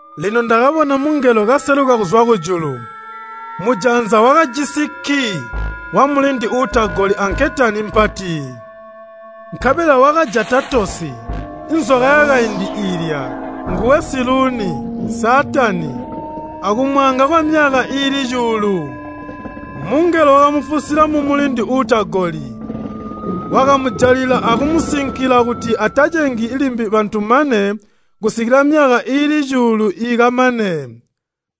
Lino ndakabona mungelo kaseluka kuzwa kujulu. Mujanza wakajisi kkii wamulindi uutagoli anketani mpati. Nkabela wakajata tosi, nzoka yakaindi iilya, nguwe Siluuni, Saatani, akumwaanga kwamyaka iili cuulu. Mungelo wakamufusila mumulindi uutagoli, wakamujalila akumusinkila kuti atacengi limbi bantu mane kusikila myaka iili cuulu ikamane.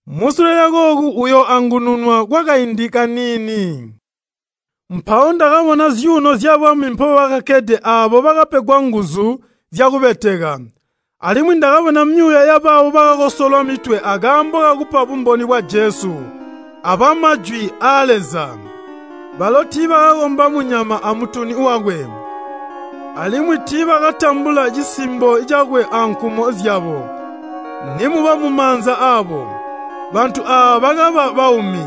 Musule lyakooku uyooangununwa kwakaindi kaniini. Mpawo ndakabona zyuuno zyabwami mpobakkede aabo bakapegwa nguzu zyakubeteka. Alimwi ndakabona myuuya yabaabo bakakosolwa mitwe akaambo kakupa bumboni bwa Jesu abwa Majwi aa Leza. Balo tiibakakomba munyama amutuni wakwe, alimwi tiibakatambula cisimbo cakwe ankumo zyabo nimuba mumaanza aabo. Bantu aaba bakaba baumi,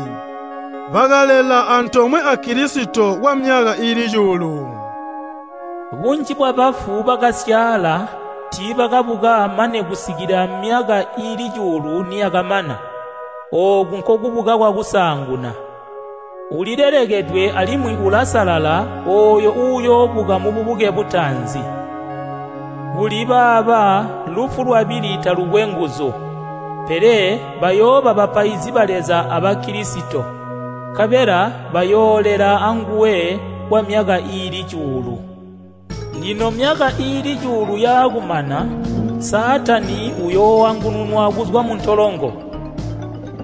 bakalela antoomwe a Kilisito kwamyaka iili cuulu. Bunji bwabafu bakasyaala, tiibakabuka mane kusikila myaka iili cuulu niyakamana. Ooku nkokubuka kwakusaanguna. Ulilelekedwe alimwi ulasalala ooyo uuyoobuka mububuke butaanzi. Kuli baaba lufu lwabili talukwe nguzu, pele bayooba bapaizi ba Leza aba Kilisito, nkabela bayoolela anguwe kwamyaka iili cuulu. Lino myaka iili cuulu yaakumana, Saatani uyooangununwa kuzwa muntolongo,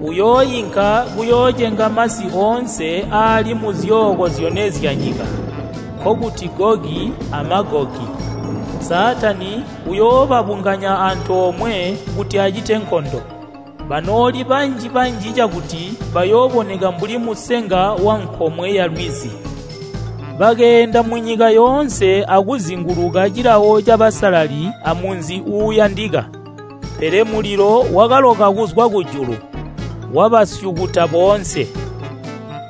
uyooinka kuyoocenga masi oonse aali muzyooko zyone zyanyika, nkokuti Gogi a Magogi. Saatani uyoobabunganya antoomwe kuti acite nkondo, banooli banji-banji cakuti bayooboneka mbuli musenga wankomwe yalwizi. Bakeenda munyika yoonse akuzinguluka cilawo cabasalali amunzi uuyandika. Pele mulilo wakaloka kuzwa kujulu, wabasyukuta boonse.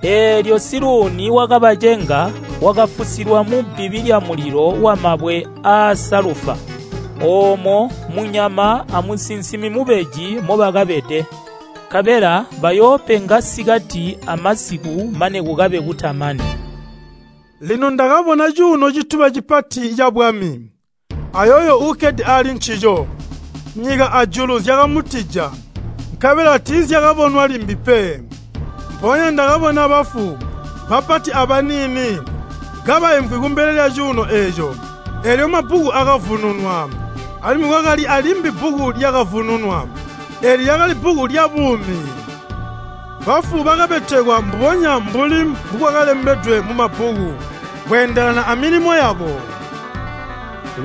Eelyo Siluuni wakabacenga wakafusilwa mubbibi lyamulilo wamabwe aasalufa, oomo munyama amusinsimi mubeji mobakabede. Nkabela bayoopenga sikati amasiku mane kukabe kutamani. Lino ndakabona cuuno cituba cipati cabwami, ayooyo uukkede ali ncico. Nyika ajulu zyakamutija, nkabela tiizyakabonwa limbi pe. Mpoonya ndakabona bafu, bapati abaniini, kabaimvwi kumbele lyacuuno eeco, eelyo mabbuku akavununwa. Alimwi kwakali alimbi bbuku lyakavununwa, eeli lyakali bbuku lyabuumi. Bafu bakabetekwa mbubonya mbuli mbukwakalembedwe mumabbuku, kweendelana amilimo yabo.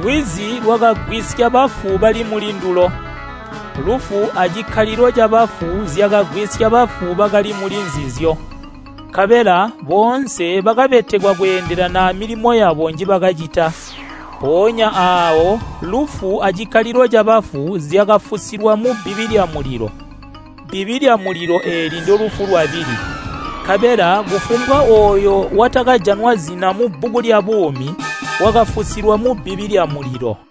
Lwizi lwakagwisya bafu bali muli ndulo. Lufu acikkalilo cabafu zyakagwisya bafu bakali muli nzizyo, nkabela boonse bakabetekwa kweendelana amilimo yabo njibakacita. Mpoonya aawo lufu acikkalilo cabafu zyakafusilwa mubbibi lyamulilo. (Bbibi lyamulilo eeli ndolufu lwabili.) Nkabela kufumbwa ooyo watakajanwa zina mubbuku lyabuumi wakafusilwa mubbibi lyamulilo.